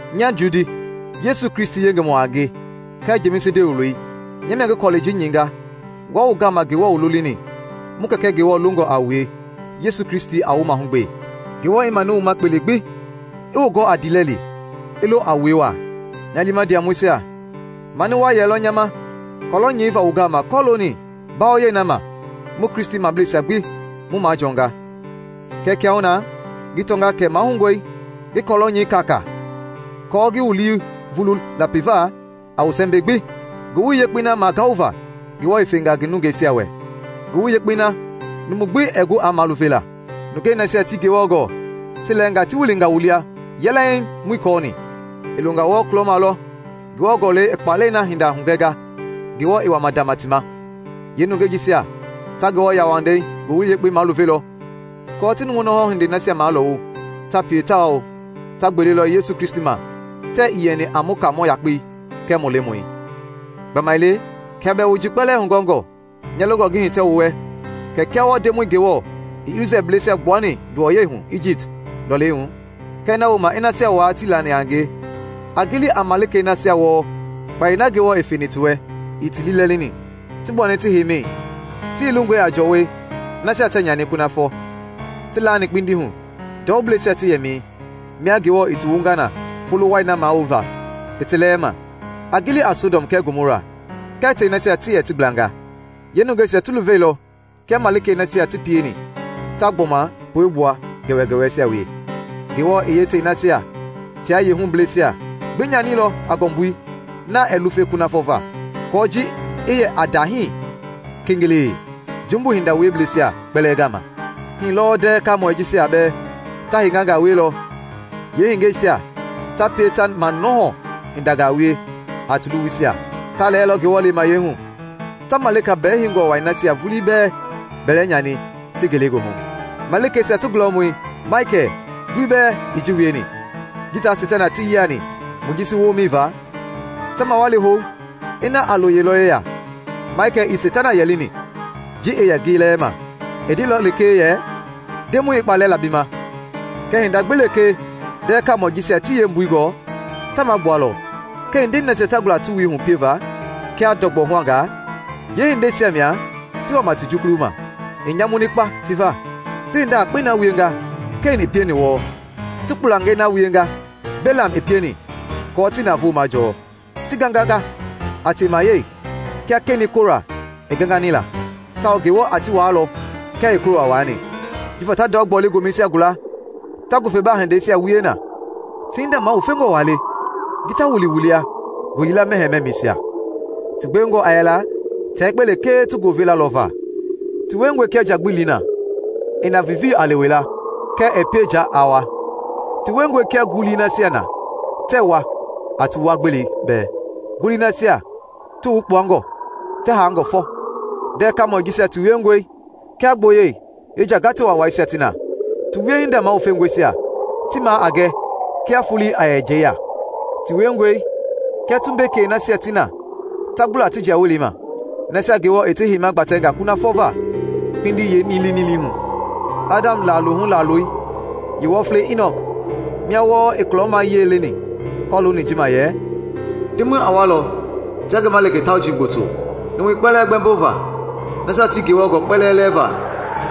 Nya Judi, Yesu Kristi yengemɔ a nge kɛɛ Jemisi ndewe wuloi, nya mia ngi kɔlɛi ji nyɛinga wua wu gama Ngewɔ wu lolini, mu Kɛkɛ Ngewɔ longɔ a wue, Yesu Kristi a wu mahugbe: Ngewɔ i manu wu ma kpele gbi, i wu gɔ a ndiilɛli, i lo a wue waa. Nya liima ndiamɔisia, mani waa yɛlɔ nya ma kɔlɔ nyɛiva wu gama kɔlooni mbawoyɛi na ma mu Kristimableisia gbi mu majɔnga. Kɛɛ kiahuna ngi tɔnga kɛ mahoungɔe ngi kɔlɔ nyɛi kaakaa aako ngi wu lii vulu lapiva a wu sɛmbɛi gbi Ngowili Yekpei na magaova Ngewɔ i fenga ngi nungeisia wɛ, Ngowili Yekpei na mumu gbi ɛɛ gu a maluvela. Nungɛi nasia tii Ngewɔ gɔɔ ti lɛɛnga ti wilinga wu lia yɛlɛŋ muii kɔɔni. I Ionga wɔɔ kulɔma lɔ Ngewɔ Gɔlɛi i kpaalɛi na hinda hugɛnga Ngewɔ i wama ndama ti ma. Yeenungɛi jisia ta Ngewɔ yauwandei yeengowili maluvelɔ aako ti numu nɔhɔ hindei nasia malɔwu ta pie tawao ta gbelelɔ Yesu Kristi ma tɛɛ ii yɛni a mu Kaamɔ yakpei kɛɛ mu Lemɔi. Gbamaile kia bɛɛ wu ji kpɛlɛɛ hugɔɔngɔ, nya longɔ ngi hitɛ wu wɛ kia wɔɔ Ndemɔi Ngewɔ i Isrɛelblɛisia gbuani nduwɔyɛi hu Ijipt lɔlei hu kɛɛ na wooma i nasia waa tii lani a ngie. A gili a malikei nasia wɔɔ kpayei na Ngewɔ i feni ti wɛ ii ti liilɛlini, ti gbuani ti heimɛi, ti yilingɔe a jɔwɔi nasia tɛɛ nyani kunafɔ, ti laani kpindi hu ndɔubleisia ti yɛmɛi, mia Ngewɔ i ti wunga na folo wai na mawulova i ti lɛɛ ma. A gili a Sɔdɔm kɛɛ Gomɔra kɛɛ tei nasia ti yɛ ti gblanga, yeenungeisia ti luveilɔ kia malikei nasia ti pieni, ta gbɔma puegbua gɛwɛgɛwɛisia wie. Ngewɔ i yeetei nasia tia yeehublɛisia gbi nyanilɔ a ngɔmbui na ɛɛ lufe kunafɔ va, kɔɔ ji i yɛ a ndahii kengelee jumbu hinda wieblɛisia kpɛlɛɛ gama. Hii lɔɔ ndɛɛ kaamɔi jisia bɛɛ ta hengangaa wielɔ, yeehengɛisia ta pie ta manɔhɔ hindangaa wie a ti luwuisia; ta lɛɛlɔ Ngewɔ lemayɛi hu, ta malika bɛɛheingɔ wai nasia vulii bɛɛ bɛlɛnyani ti ngelegoohu. Malikeisia ti gulɔmɔi Maikɛl vulii bɛɛ ii ji wieni. Ji taa Seitana ti yiani Mojisi woomɛi va, ta mawali hou ina a lo ye lɔ yeya, Maikɛl ii Seitana yɛlini ji i yɛ ngi lɛɛma, i ndeilɔ lekee yɛ, “Ndemɔi i kpaalɛ la bi ma!” Kɛɛ hinda gbi lekee ndɛɛ kaamɔi jisia tii yeembui gɔɔ, ta magbualɔ, kɛɛ hindei nasia ta gula ti wui hu pieva kia ndɔgbɔ-huangaa, yeehindeisia mia ti wama ti jukuluma. I nyamuni kpa ti va! Ti hinda yakpei na wienga Ken i pieni wɔɔ. Ti kpulangei na wienga Belam i pieni aako ti navoo majɔɔ. Ti ganganga a temayɛi kia Kenɛi Kora i gangani la, tawao Ngewɔ a ti waalɔ kia i Kora waani. Jifa ta ndɔ-gbɔle gomɛisia gula ta ngufebaa hindeisia wie na; ti hinda mawufengɔ waa le ji ta wili wu lia ngooyila mɛhɛɛ mɛmɛisia. Ti gbewengɔ a yɛla tia yekpe lekee ti goovela lɔ va. Ti wiengɔe kia njagbili na i na viivii a lewe la kɛɛ ɛɛ pie nja aa wua. Ti wiengɔe kia ngulii nasia na tɛɛ wua a ti wua-gbelei bɛɛ, ngulii nasia ti wukpuangɔ, ti haangɔ fɔ. Ndɛɛ kaamɔi jisia ti wiengɔe kia gboyɛi yeenjagate waawaisia ti na, ti wiehinda mawufengɔisia ti maa a gɛ kia fuulei a yɛ njɛi ya. Ti wiengɔe kia tumbekei nasia ti na ta gbula ti jiawelei ma, nasia Ngewɔ i ti heima gbatɛnga kunafɔ va kpindi yeenilinilii hu. Adam laalohu laaloi yeewɔflei Inɔk mia wɔɔ i kulɔmayia leni kɔlooni ji ma yɛ, “Ndemɔi a walɔ tia ngi malika tauji gboto, numui kpɛlɛɛ gbɛmbova, nasia tii Ngewɔ gɔɔ kpɛlɛɛ lɛɛva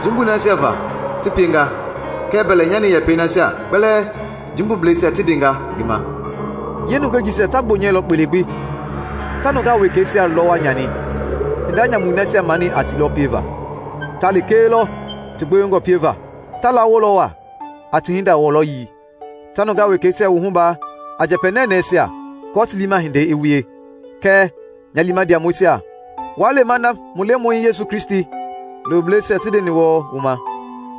jumbui nasia va ti pienga kɛɛ mbɛlɛnyani yɛpɛi nasia kpɛlɛɛ jumbubleisia ti ndenga ngi ma.” Yeenungɛi jisia ta gbonyɛlɔ kpele gbi, ta nungaa wekɛisia lɔwa nyani; hinda nyamui nasia mani a ti lɔ pieva, ta lekee lɔ ti gbewengɔ pieva; ta lawolɔ waa a ti hinda wɔlɔyii, ta nungaa wekɛisia wuhuba a njɛpɛ nɛnɛɛisia aako ti liima hindei i wie. Kɛɛ, nya liima ndiamɔisia, waa lema na mu Lemɔi Yesu Kristi looblɛisia ti ndeni wɔɔ wu ma.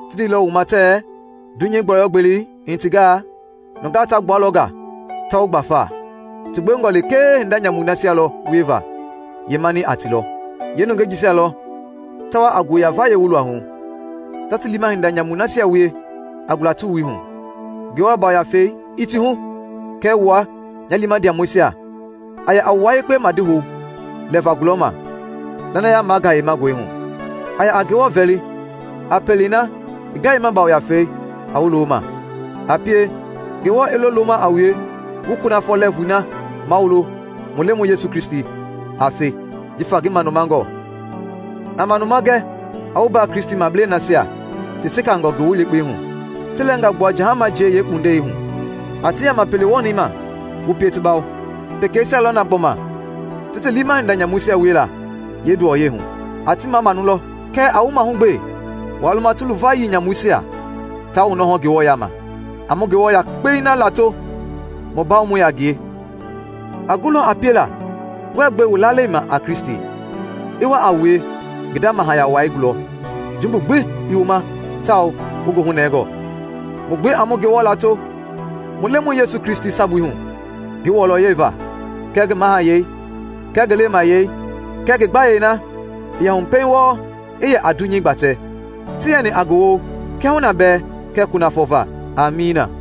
Ti ndeilɔ wu ma tɛɛ, “Dunyei gbɔyɔ gbelei i hitingaa, nungaa ta gbualɔ nga ta wu gbafa, ti gbewengɔ lekee hinda nyamui nasia lɔ wieva yeemani a ti lɔ.” Yeenungɛi jisia lɔ ta wa a ngo-ya-vayei wu luahu, ta ti liima hinda nyamui nasia wie a gula ti wui hu, Ngewɔ Yafei ii ti hu. Kɛɛ wua, nya liima ndiamɔisia, a yɛ a wua yekpe madihou lɛva gulɔma lanaya magayemangɔi hu. A yɛ a Ngewɔ vɛli a pelei na ngi Gayema Yafei a wu lo ma. A pie, Ngewɔ i lo loma a wue, wu kunafɔ lɛɛvui na mawulo mu Lemɔi Yesu Kristi a fe jifa ngi manumangɔ. A manuma gɛ a wu mbaa Kristimablei nasia ti sekangɔ Ngowili Yekpei hu; ti lɛɛnga gbua jahama jie yeekpundei hu; a ti yama pele wɔnɛi ma wu pie ti bawo. Pekeisia lɔ na gbɔma ti ti liima hinda nyamuisia wiela yeenduwɔyei hu: a ti mamamau lɔ, kɛɛ a wu mahugbe waa luma ti luvayii nyamuisia taa wu nɔhɔ Ngewɔ yama. A mu Ngewɔ yakpei na lato mu bawomɔi a ngie! A gulɔ a piela wuɛɛ gbe wu lalei ma a Kristi, i wa a wue ngi nda mahaya wai gulɔ jumbu gbi ii wu ma tawao wu goohu nɛngɔ. Mu gbi a mu Ngewɔ lato mu Lemɔi Yesu Kristi sabui hu ngi wɔlɔyɛi va kɛɛ ngi mahayɛi kɛɛ ngi lemayɛi kɛɛ ngi gbayei na i yɛ hu pɛiŋ wɔɔ i yɛ a dunyei gbatɛ tawao ti yɛni a ngi woo kiahuna bɛɛ kɛɛ kunafɔ va! Amiina.